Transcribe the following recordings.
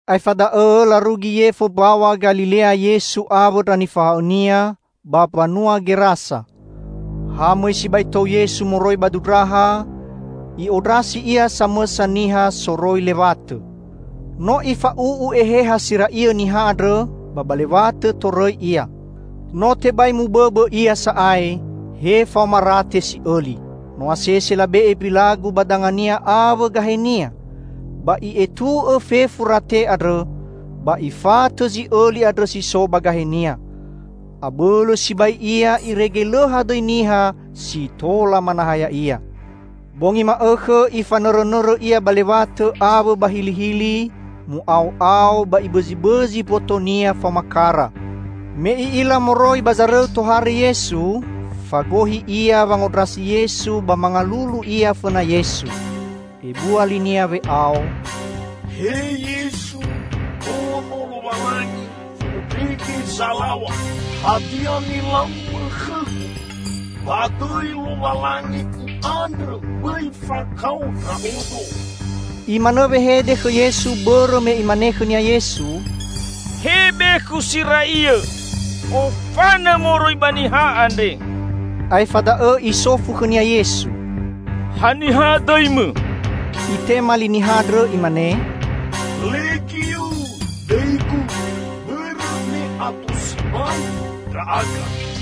Aefa da'õ larugi yefo Mbaw̃a Galilea Yesu awõ ndra nifahaõ-Nia, ba mbanua Gerasa. Ha mõi sibai tou Yesu moroi ba dundraha, i'ondrasi Ia samõsa niha soroi lewatõ. No ifa'u'u eheha si ra'iõ niha andrõ ba ba lewatõ torõi ia. No tebai mubõbõ ia sa'ae, he faoma rate si'õli. No asese labe'e mbilagu ba dangania awõ gahenia, ba i'etu'õ fefu rate andrõ, ba ifatõ zi'õli andrõ si so ba gahenia. Abõlõ sibai ia irege lõ hadõi niha si tola manaha ya'ia. Bongi ma'õkhõ ifanõrõnõrõ ia ba lewatõ awõ ba hilihili, mu'ao'ao, ba ibõzibõzi mbotonia faoma kara. Me i'ila moroi ba zarõu tohare Yesu, fagohi ia wangondrasi Yesu ba mangalulu ia fõna Yesu. Ebua linia we'ao, "He Yesu, Ono Lowalangi Fondrege Zalaw̃a! Hadia nilau-Mõ khõgu? Ba dõi Lowalangi u'andrõ bõi fakao ndra'odo!" (Imanõ wehede khõ Yesu bõrõ me Imane khõnia Yesu, "He bekhu si ra'iõ, ofanõ moroi ba niha andre!") Aefa da'õ Isofu khõnia Yesu, "Haniha dõimõ?" Itema li niha andrõ imane, "'Legiu' dõigu bõrõ me ato sibai ndra'aga."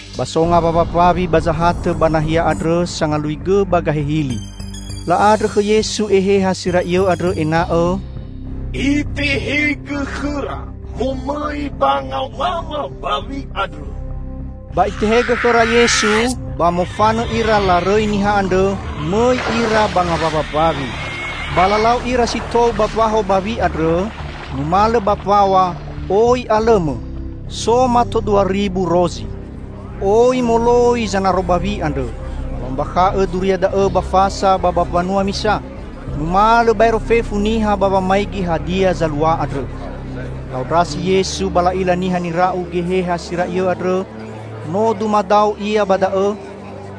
Ba so ngawawa mbawi ba zahatõ ba nahia andrõ sangalui gõ ba gahe hili. La'andrõ khõ Yesu eheha si ra'iõ andrõ ena'õ, "Itehegõ khõra momõi ba ngawawa mbawi andrõ." Ba Itehegõ khõra Yesu, ba mofanõ ira larõi niha andrõ mõi ira ba ngawawa mbawi. Ba lalau ira si tou ba mbaho bawi andrõ, numalõ ba mbaw̃a, oi alõmõ, so mato dua ribu rozi. Oi moloi zanaro bawi andrõ, ba la'ombakha'õ duria da'õ ba fasa ba ba mbanua misa. Numalõ baero fefu niha ba wamaigi hadia zalua andrõ. La'ondrasi Yesu ba la'ila niha nira'u geheha si ra'iõ andrõ no dumadao ia ba da'õ.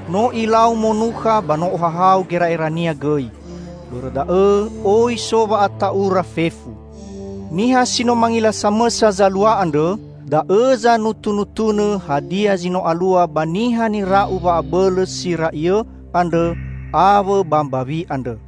No ilau monukha ba no ohahau gera'erania gõi. Bõrõ da'õ oi so wa'ata'ura fefu. Niha si no mangila samõsa zalua andrõ, da'õ zanutunutunõ hadia zi no alua ba niha nira'u wa'abõlõ si ra'iõ andrõ awõ ba mbawi andrõ.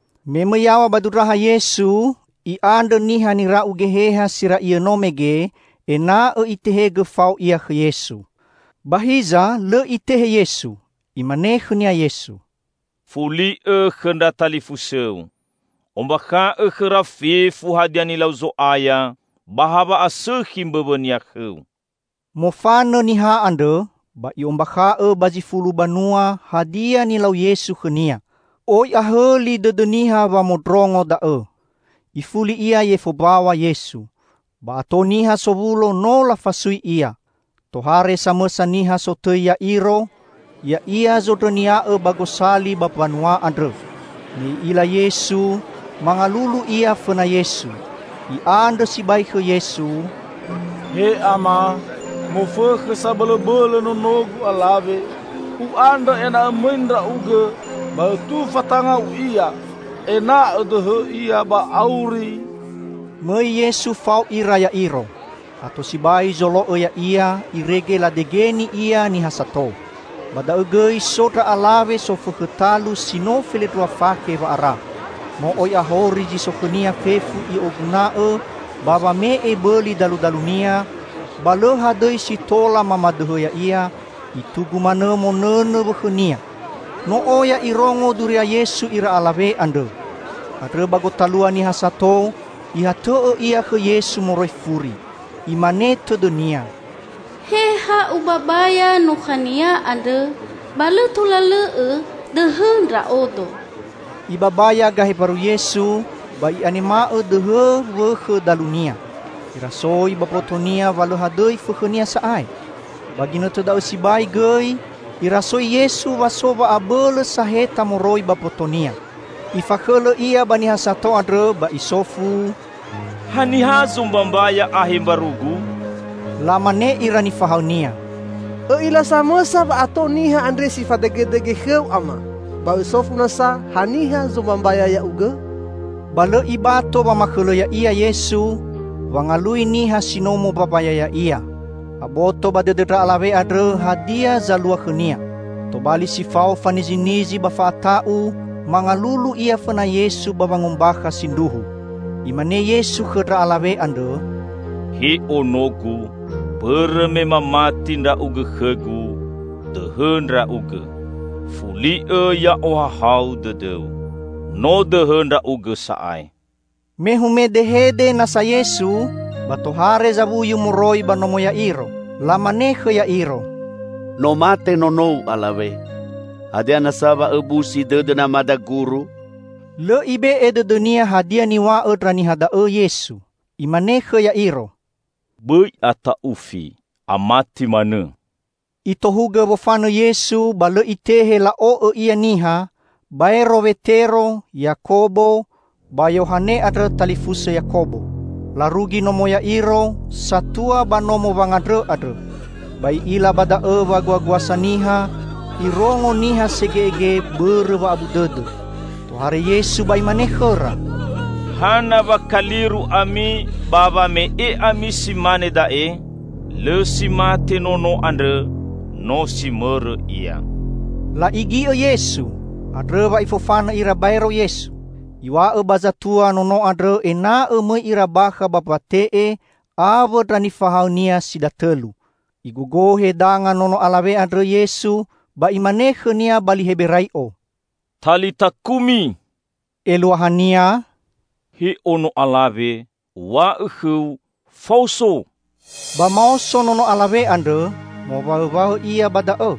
Me mõi yaw̃a ba dundraha Yesu, i'andrõ niha nira'u geheha si ra'iõ no mege ena'õ Itehegõ fao ia khõ Yesu. Ba hiza lõ Itehe Yesu. Imane khõnia Yesu, "Fuli'õ khõ ndra talifusõu. Ombakha'õ khõra fefu hadia nilau Zo'aya ba hawa'asõkhi mbõwõ-Nia khõu!" Mofanõ niha andrõ, ba i'ombakha'õ ba zi fulu banua hadia nilau Yesu khõnia. Oi ahõli dõdõ niha wamondrongo da'õ. Ifuli Ia yefo mbaw̃a Yesu. Ba ato niha sowulo no lafasui Ia. Tohare samõsa niha sotõi Ya'iro, ya'ia zondrõnia'õ ba gosali ba mbanua andrõ. Me i'ila Yesu, mangalulu ia fõna Yesu. I'andrõ sibai khõ Yesu, "He Ama, mofõkhõ sabõlõbõlõ nonogu alawe, u'andrõ ena'õ mõi Ndra'ugõ ba Õtufa tanga-U ia, ena'õ dõhõ ia ba auri!" Mõi Yesu fao ira Ya'iro. Ato sibai zolo'õ Ya'ia irege ladegeni Ia niha sato. Ba da'õ gõi so ndra alawe sofõkhõ talu si no felendrua fakhe wa'ara. No oi ahori zi so khõnia fefu i'oguna'õ ba wame'e bõli daludalunia, ba lõ hadõi si tola mamadõhõ ya'ia, itugu manõ monõnõ wõkhõnia. No oya irongo duria Yesu ira alawe andrõ. Andrõ ba gotalua niha sato, ihatõ'õ ia khõ Yesu moroi furi. Imane tõdõnia, "He ha ubabaya nukha-Nia andrõ, ba lõ tola lõ'õ dõhõ ndra'odo!" Ibabaya gahe mbaru Yesu, ba i'anema'õ dõhõ wõkhõ dalunia. Irasoi ba mbotonia wa lõ hadõi fõkhõnia sa'ae. Ba ginõtõ da'õ sibai gõi Irasoi Yesu wa so wa'abõlõ saheta moroi ba mboto-Nia. Ifakhõlõ Ia ba niha sato andrõ ba Isofu, "Haniha zombambaya ahe mbaru-Gu?" Lamane ira nifahaõ-Nia, "Õ'ila samõsa wa'ato niha andre si fadegedege khõ-U, Ama, ba Õsofu nasa, haniha zombambaya Ya'ugõ?" Ba lõ Ibato wamakhõlõ Ya'ia Yesu, wangalui niha si no mombambaya Ya'ia. Aboto ba dõdõ ndra alawe andrõ hadia zalua khõnia. Tobali si fao fanizinizi ba fa'ata'u mangalulu ia fõna Yesu ba wangombakha sindruhu. Imane Yesu khõ ndra alawe andrõ, "He ono-Gu, bõrõ me mamati ndra'ugõ khõ-Gu, dõhõ ndra'ugõ! Fuli'õ ya'ohahau dõdõu. No dõhõ ndra'ugõ sa'ae!" Me humedehede nasa Yesu, ba tohare zawuyu moroi ba nomo Ya'iro. Lamane khõ Ya'iro, "No mate nonou alawe, hadia nasa wa õbusi dõdõ namada, Guru?" Lõ Ibe'e dõdõ-Nia hadia niw̃a'õ ndra niha da'õ Yesu. Imane khõ Ya'iro, "Bõi ata'ufi, amati manõ!" Itohugõ wofanõ Yesu ba lõ Itehe la'o'õ Ia niha, baero Wetero, Yakobo ba Yohane andrõ talifusõ Yakobo. Larugi nomo Ya'iro, satua ba nomo wangandrõ andrõ. Ba I'ila ba da'õ waguaguasa niha, Irongo niha sege'ege bõrõ wa'abu dõdõ. Tohare Yesu ba Imane khõra, "Hana wa kaliru ami ba wa me'e ami si mane da'e? Lõ si mate nono andrõ, no si mõrõ ia!" La'igi'õ Yesu. Andrõ wa Ifofanõ ira baero Yesu. Iw̃a'õ ba zatua nono andrõ ena'õ mõi ira bakha ba mbate'e awõ ndra nifahaõ-Nia si datõlu. Igogohe danga nono alawe andrõ Yesu ba Imane khõnia ba li Heberai'o, "Talita kumi," eluahania, "He ono alawe, Uw̃a'õ khõu: faoso!" Ba maoso nono alawe andrõ, mowaõwaõ ia ba da'õ.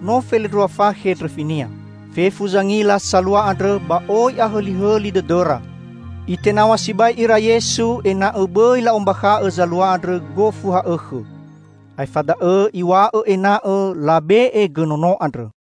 (No felendrua fakhe ndrõfinia.) Fefu zangila salua andrõ ba oi ahõlihõli dõdõra! Itenaw̃a sibai ira Yesu ena'õ bõi la'ombakha'õ zalua andrõ gofu ha'õkhõ. Aefa da'õ Iw̃a'õ ena'õ labe'e gõ nono andrõ.